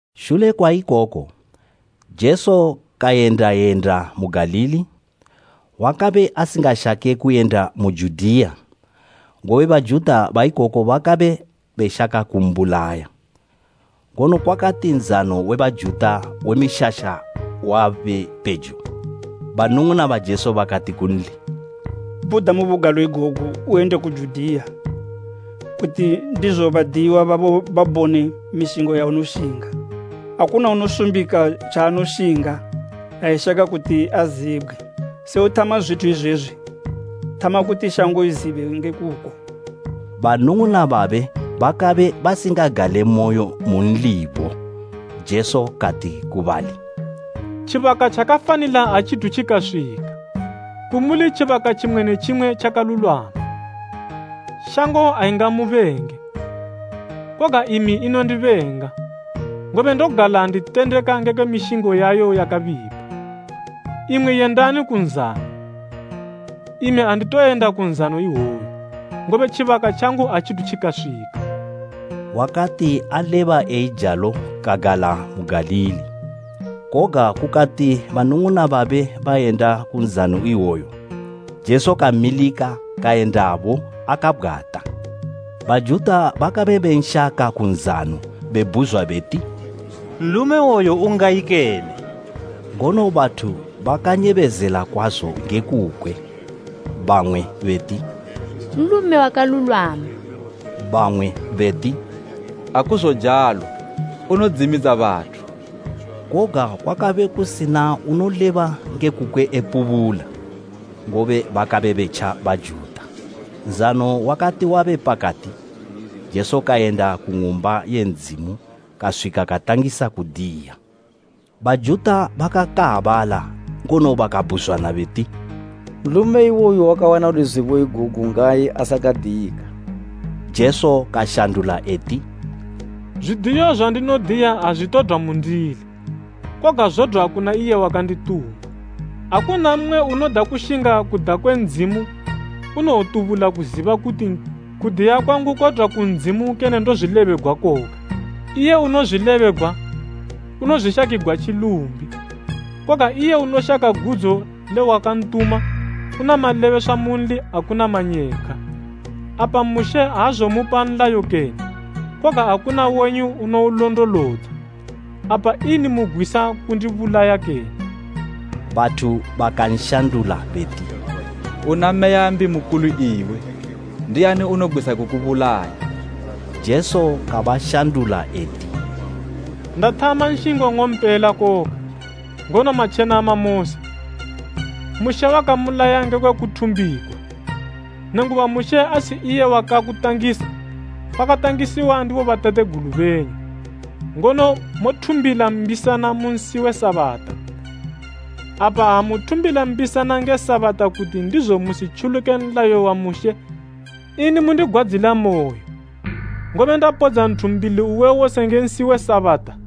Shule kwa ikoku Jesu kayenda yenda mu Galili, wakabe asingashake kuyenda mu Judiya, ngobe Bajuta baikoko bakabe beshaka kumbulaya. Ngono kwakati Nzano we Bajuta we Mishasha wabe pejo, banung'una ba Jesu bakati kunli, “Bhuda mu bugalo igogu uyende ku Judiya, kuti ndizo badiyiwa babo babone mishingo yaunoshinga. Akuna unosumbika tjaanoshinga ha eshaka kuti azibgwe. Se uthama zwithu izwezwi, thama kuti shango izibe nge kuko.” Banung'una babe bakabe basingagalemoyo munlibo. Jesu kati ku bali, “Tjibaka tjakafanila atjithu tjikaswika, kumuli tjibaka tjimwe ne tjimwe tjakalulwama. Shango aingamubenge, koga imi inondibenga, ngobe ndogala nditendeka ngekwe mishingo yayo yakabipa. Imwi yendani ku nzano. Imi anditoyenda ku nzano iwoyu, ngobe tjibaka tjangu atjithu tjikaswika.” Wakati aleba eijalo kagala mu Galili. Koga kukati banung'una babe bayenda ku Nzano we Mishasha, Jesu kamilika kayendabo akabgwata. Bajuta bakabe benshaka ku nzano, bebhuzwa beti, “Nlume iwoyo ungayi kene?” Ngono bathu bakanyebezela kwazo nge kukwe. Bamwe beti, “Nlume wakalulwama.” Bamwe beti, “Akuzojalo, unodzimidza bathu.” Koga kwakabe kusina unoleba nge kukwe epubula, ngobe bakabe betja Bajuta. Nzano wakati wabe pakati, Jesu kayenda ku Ng'umba ye Ndzimu kaswika katangisa kudiya. Bajuta bakakaabala ngono bakabhuzwana beti, “Nlume iwoyu wakawana luzibo igogu ngayi asakadiyika?” Jesu kashandula eti, “Zwidiyo zwandinodiya azwitodwa mundili, koga zodwa kuna iye wakandituma. Akuna mmwe unoda kushinga kuda kwe Ndzimu unowotubula kuziba kuti kudiya kwangu kodwa ku Ndzimu kene ndozwilebegwa koga. Iye unozwilebegwa, unozwishakigwa tjilumbi. Koga iye unoshaka gudzo le wakantuma, una malebeswa munli akuna manyepkhwa. Apa Mushe azomupa nlayo kene, koga akuna wenyu unoulondolodza. Apa ini mugwisa kundibulaya kene?” Bathu bakanshandula beti, “Una meya mbi mukuli iwe! Ndiani unogwisa kukubulaya?” Jesu kabashandula eti, “Ndathama nshingo nng'ompela koga, ngono matjenama mose. Mushe wakamulaya ngekwe kuthumbigwa, nenguba Mushe asi iye wakakutangisa, kwakatangisiwa ndi bobatategulu benyu, ngono mothumbila mbisana mu nsi we Sabata. Apa ha muthumbila mbisana nge Sabata kuti ndizo musitjuluke nlayo wa Mushe, ini mundigwadzilamoyo, ngobe ndapodza nthu mbili uwe wose nge nsi we Sabata?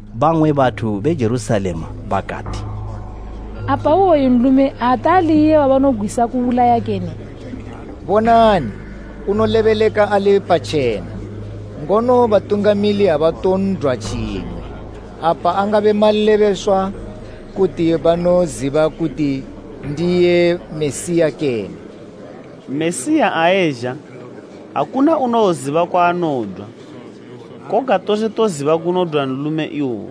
Ipapo bamwe bathu be Jerusalema bakati, “Apa iwoyu nlume ate ali iye wabanogwisa kubulaya kene? Bonani! Unolebeleka ali patjena, ngono batungamili abaton'dwa tjimwe! Apa angabe malebeswa kuti banoziba kuti ndiye Mesiya kene? Mesiya ha ezha, akuna unowoziba kwaanodwa. Koga tose toziba kunodwa nlume iwoyu.”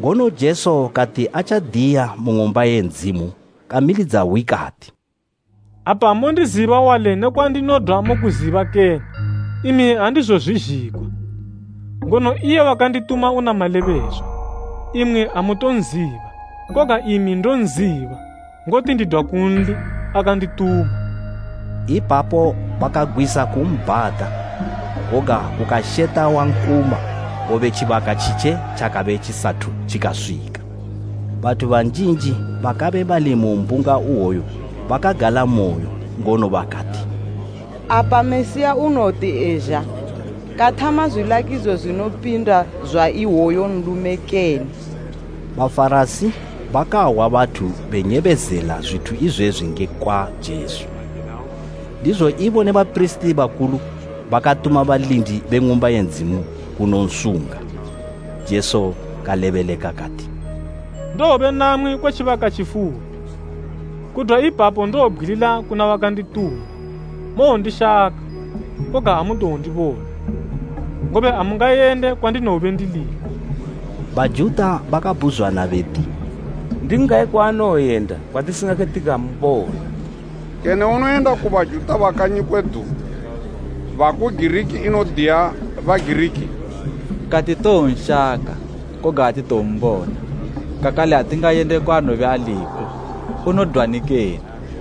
Ngono Jesu kati atjadiya mu Ng'umba ye Ndzimu kamilidza hwi kati, “Apa mondiziba wali ne kwandinodwa mokuziba kene? Imi andizozwizhigwa, ngono iye wakandituma una malebeswa. Imwi amutonziba, koga imi ndonziba, ngoti ndidwa kunli, akandituma.” Ipapo bakagwisa kumbhata, koga kukasheta wankuma, ngobe tjibaka tjitje tjakabe tjisathu tjikaswika. Bathu banjinji bakabe bali mu mbunga iwoyo bakagalamoyo ngono bakati, “Apa Mesiya unowoti ezha, kathama zwilakidzo zwinopinda zwa iwoyu nlume kene?” Bafarasi bakahwa bathu benyebezela zwithu izwezwi ngekwa Jesu, ndizo ibo ne bapirisiti bakulu bakatuma balindi be Ng'umba ye Ndzimu kunonsunga. Jesu kalebeleka kati, “Ndowobe namwi kwe tjibaka tjifupi, kudwa ipapo ndowobgwilila kuna wakandituma. Mowondishaka, koga amutowondibona, ngobe amungayende kwandinowobe ndiliko.” Bajuta bakabhuzwana beti, “Ndi ngayi kwaanowoyenda kwatisingake tikambona? Kene unowoyenda ku Bajuta ba kanyi kwedu baku Giriki enodiya Bagiriki? Kati towonshaka koga atitowombona, kakale atingayende kwaanowobe aliko. Unodwani kene?”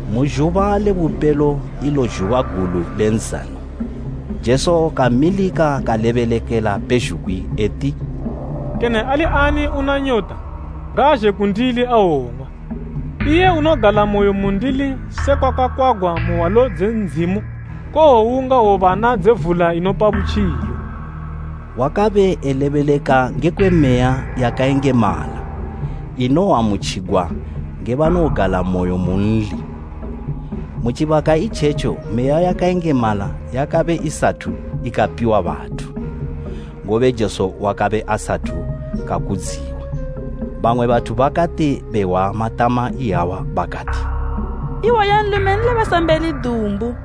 Mu zhuba le bupelo ilo zhuba gulu le nzano, Jesu kamilika kalebelekela pezhugwi eti, “Kene ali ani una nyota ngaazhe kundili awong'wa. Iye unogalamoyo mundili sekwa kwakakwagwa mu hwalo dze Ndzimu, kowowunga hwobana dze vula inopa butjilo.” Wakabe elebeleka ngekwe Meya yakayengemala, inowoamutjigwa nge banogalamoyo munli. Mu tjibaka itjetjo Meya yakayengemala yakabe isathu ikapiwa bathu, ngobe Jesu wakabe asathu kakudziwa. Bamwe bathu bakati behwa matama iyawa bakati, “Iwoyu nlume Nlebesambeli dumbu!”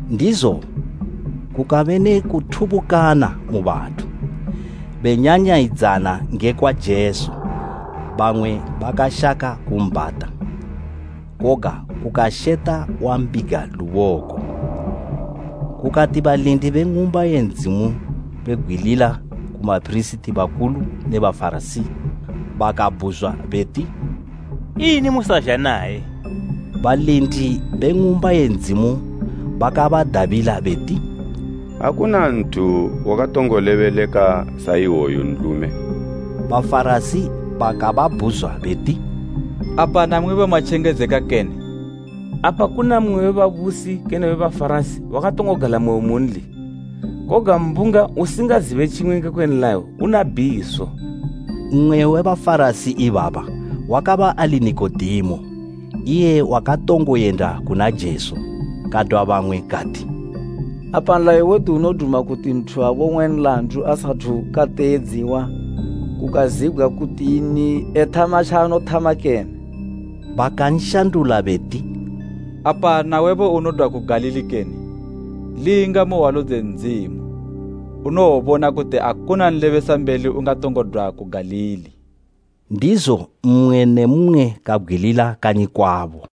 Ndizo kukabe ne kuthubukana mu bathu, benyanyayidzana ngekwa Jesu. Bamwe bakashaka kumbhata, koga kukasheta wambiga luboko. Kukati balindi be Ng'umba ye Ndzimu bebgwilila ku bapirisiti bakulu ne Bafarasi, bakababhuzwa beti, “Ini musazha naye?” Balindi be Ng'umba ye Ndzimu bakabadabila beti, “Akuna nthu wakatongo lebeleka sa iwoyu nlume!” Bafarasi bakababhuzwa beti, “Apa namwibo matjengedzeka kene? Apa kuna mmwe we babusi kene we Bafarasi wakatongo galamoyo munli? Koga mbunga usingazibe tjimwe ngekwe nlayo, una bhiso.” Mmwe we Bafarasi ibaba wakabe ali Nikodemo, iye wakatongo yenda kuna Jesu. Kadwa bamwe kati, “Apa nlayo wedu unoduma kuti nthu abong'we nlandu asathu kateedziwa kukazibgwa kuti ini ethama tjaanothama kene?” Bakanshandula beti, “Apa nawebo unodwa ku Galili kene? Linga mu hwalo dze Ndzimu, unowobona kuti akuna nlebesambeli ungatongo dwa ku Galili.” [ Ndizo mmwe ne mmwe kabgwilila kanyi kwabo.